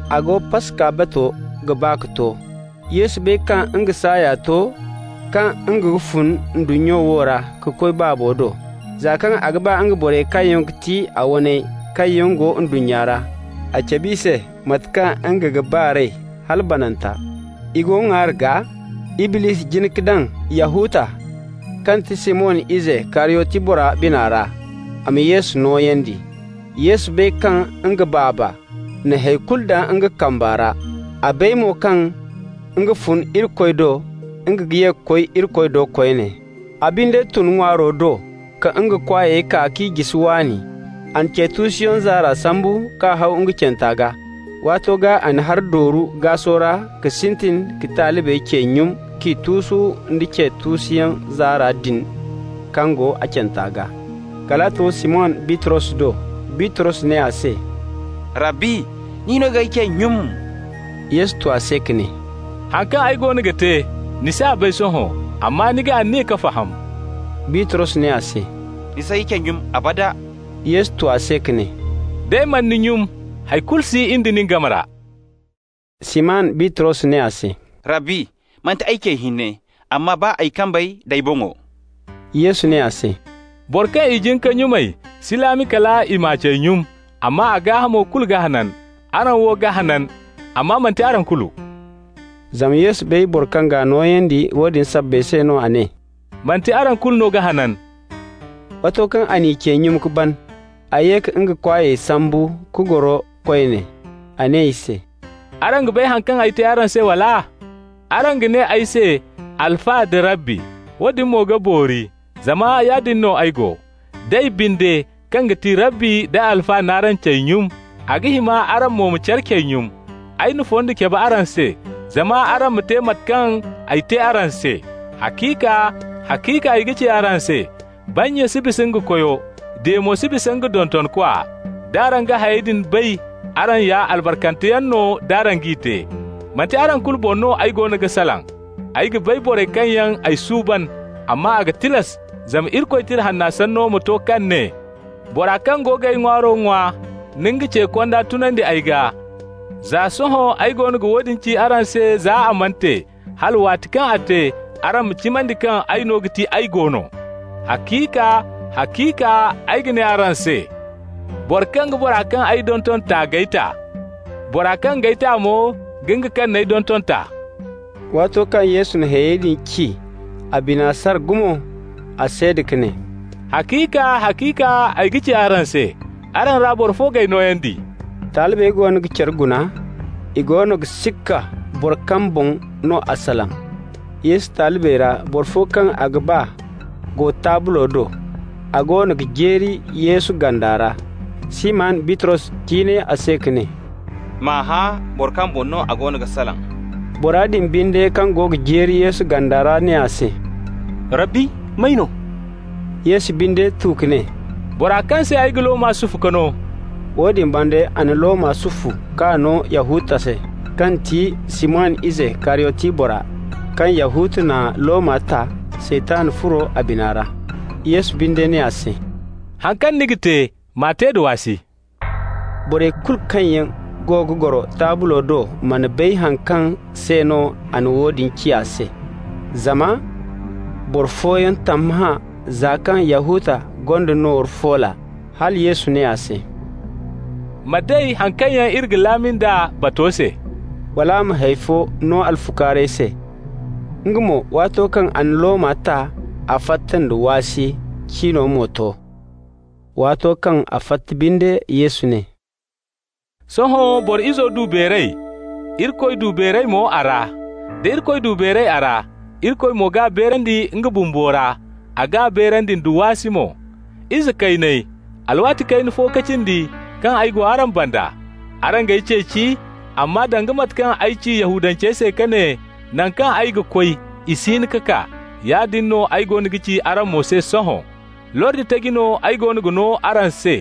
A go, Paska bato ga ba ka to. Yesu bay kaŋ nga saaya to kaŋ nga ga fun ndunnya wo ra ka koy Baabo do. Za kaŋ a ga ba nga borey kaŋ yaŋ ga ti a waney kaŋ yaŋ go ndunnya ra, a cabe i se mate kaŋ nga ga ba r'ey hala bananta. I go ŋwaari gaa. Iblisi jin ka daŋ Yahuta, kaŋ ti Siman ize Kariyoti bora bina ra a ma Yesu nooyandi. Yesu bay kaŋ nga Baaba na hay kulu daŋ nga kambe ra, a bay mo kaŋ nga fun Irikoy do, nga ga ye ka koy Irikoy do koyne. A binde tun ŋwaaro do ka nga kwaayey kaa k'i jisi waani. A na ce tuusuyaŋ zaara sambu k'a haw nga canta gaa. Waato gaa a na hari dooru gaasu ra ka sintin ka talibey cey nyum k'i tuusu nda ce tuusuyaŋ zaara din kaŋ go a canta gaa. Kal a to Siman Bitros do. Bitros ne a se: «Rabbi, ni no g'ay cey nyum?» Yesu tu a se ka ne: «Haŋ kaŋ ay goono ga te, ni s'a bay sohõ, amma ni ga aniya ka faham.» Bitros ne a se: «Ni s'ay cey nyum, abada!» Yesu tu a se ka ne: «D'ay mana ni nyum, hay kulu si in da nin game ra.» Siman Bitros ne a se: «Rabbi, manti ay cey hinne, amma baa ay kambey d'ay boŋo.» Yesu ne a se: «Boro kaŋ i jin ka nyumay si laami kal i m'a cey nyum, amma a gaahamo kulu ga hanan. Araŋ wo ga hanan, amma manti araŋ kulu.» Zama Yesu bay boro kaŋ g'a nooyandi. Woodin sabbay se no a ne: «Manti araŋ kulu no ga hanan.» Waato kaŋ a n'i cey nyum ka ban, a ye ka nga kwaayey sambu ka goro koyne. A ne i se: «Araŋ ga bay haŋ kaŋ ay te araŋ se, wala? Araŋ ga ne ay se ‹Alfa› da ‹Rabbi›. Woodin mo ga boori, zama yaadin no ay go. D'ay binde, kaŋ ga ti Rabbi nda Alfa n'araŋ cey nyum, a ga hima araŋ mo ma care cey nyum. Ay na fondo cabe araŋ se, zama araŋ ma te mate kaŋ ay te araŋ se. Haciika, haciika ay ga ci araŋ se: bannya si bisa nga koyo, diya mo si bisa nga dontonkwa. D'araŋ ga hayey din bay, araŋ ya albarkanteyaŋ no d'araŋ g'i te. Manti araŋ kulu boŋ no ay goono ga salaŋ. Ay ga bay borey kaŋ yaŋ ay suuban, amma a ga tilas zama Irikoy Tira Hanna sanno ma to kaŋ ne: ‹Bora kaŋ go g'ay ŋwaaro ŋwa na nga ce konda tunandi ay gaa.› Za sohõ ay goono ga woodin ci araŋ se za a mana te, hala waati kaŋ a te, araŋ ma cimandi kaŋ ay no ga ti AY GO NO. Haciika, haciika ay ga ci araŋ se: boro kaŋ ga bora kaŋ ay donton ta g'ay ta. Bora kaŋ g'ay ta mo ga nga kaŋ n'ay donton ta.» Waato kaŋ Yesu na hayey din ci, a bina sara gumo. A seeda ka ne: «Haciika, haciika ay ga ci araŋ se: araŋ ra boro fo g'ay nooyandi.» Talibey goono ga care guna. I goono ga sikka boro kaŋ boŋ no a salaŋ. Yesu talibey ra boro fo kaŋ a ga ba go taablo do, a goono ga jeeri Yesu ganda ra. Siman Bitros ciinay a se ka ne: «M'a hã boro kaŋ boŋ no a goono ga salaŋ.» Bora din binde kaŋ go ga jeeri Yesu ganda ra ne a se: «Rabbi, may no?» Yesu binde tu ka ne: «Bora kaŋ se ay ga looma sufu ka no.» Woodin banda a na looma sufu k'a no Yahuta se, kaŋ ti Siman ize Kariyoti bora. Kaŋ Yahuta na looma ta, Saytan furo a bina ra. Yesu binde ne a se: «Haŋ kaŋ ni ga te, m'a te da waasi.» Borey kulu kaŋ yaŋ go ga goro taablo do mana bay haŋ kaŋ se no a na woodin ci a se. Zama boro fooyaŋ tammahã, za kaŋ Yahuta gonda nooru foola, hala Yesu ne a se: «Ma day haŋ kaŋ yaŋ iri ga laami nd'a bato se,» wala a ma hay fo no alfukaarey se. Nga mo, waato kaŋ a na looma ta, a fatta nda waasi. Cino mo to. Waato kaŋ a fatta binde, Yesu ne: «Sohõ Boro Izo du beeray, Irikoy du beeray mo a ra. Da Irikoy du beeray a ra, Irikoy mo g'a beerandi nga bumbo ra, a g'a beerandi da waasi mo. Ize kayney, alwaati kayna fo ka cindi kaŋ ay go araŋ banda. Araŋ g'ay ceeci, amma danga mate kaŋ ay ci Yahudancey se ka ne naŋ kaŋ ay ga koy i si hin ka kaa, yaadin no ay goono ga ci araŋ mo se sohõ. Lordi taji no ay goono ga no araŋ se: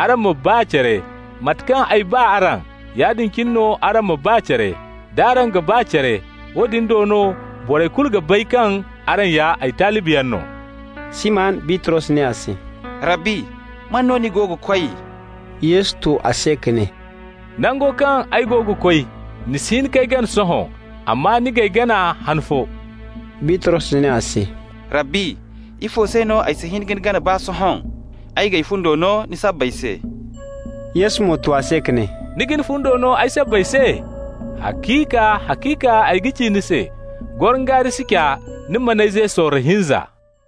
araŋ ma ba care. Mate kaŋ ay ba araŋ, yaadin cine no araŋ ma ba care. D'araŋ ga ba care, woodin do no borey kulu ga bay kaŋ araŋ ya ay talibiyaŋ no.» Siman Bitros ne a se: «Rabbi, man no ni go ga koy?» Yesu tu a se ka ne: «Nango kaŋ ay go ga koy, ni si hin k'ay gana sohõ, amma ni g'ay gana han fo.» Bitros ne a se: «Rabbi, ifo se no ay si hin ka ni gana baa sohõ? Ay g'ay fundo no ni sabbay se!» Yesu mo tu a se ka ne: «Ni ga ni fundo no ay sabbay se? Haciika, haciika ay ga ci ni se: gorongaari si ca, ni man'ay ze sorro hinza.»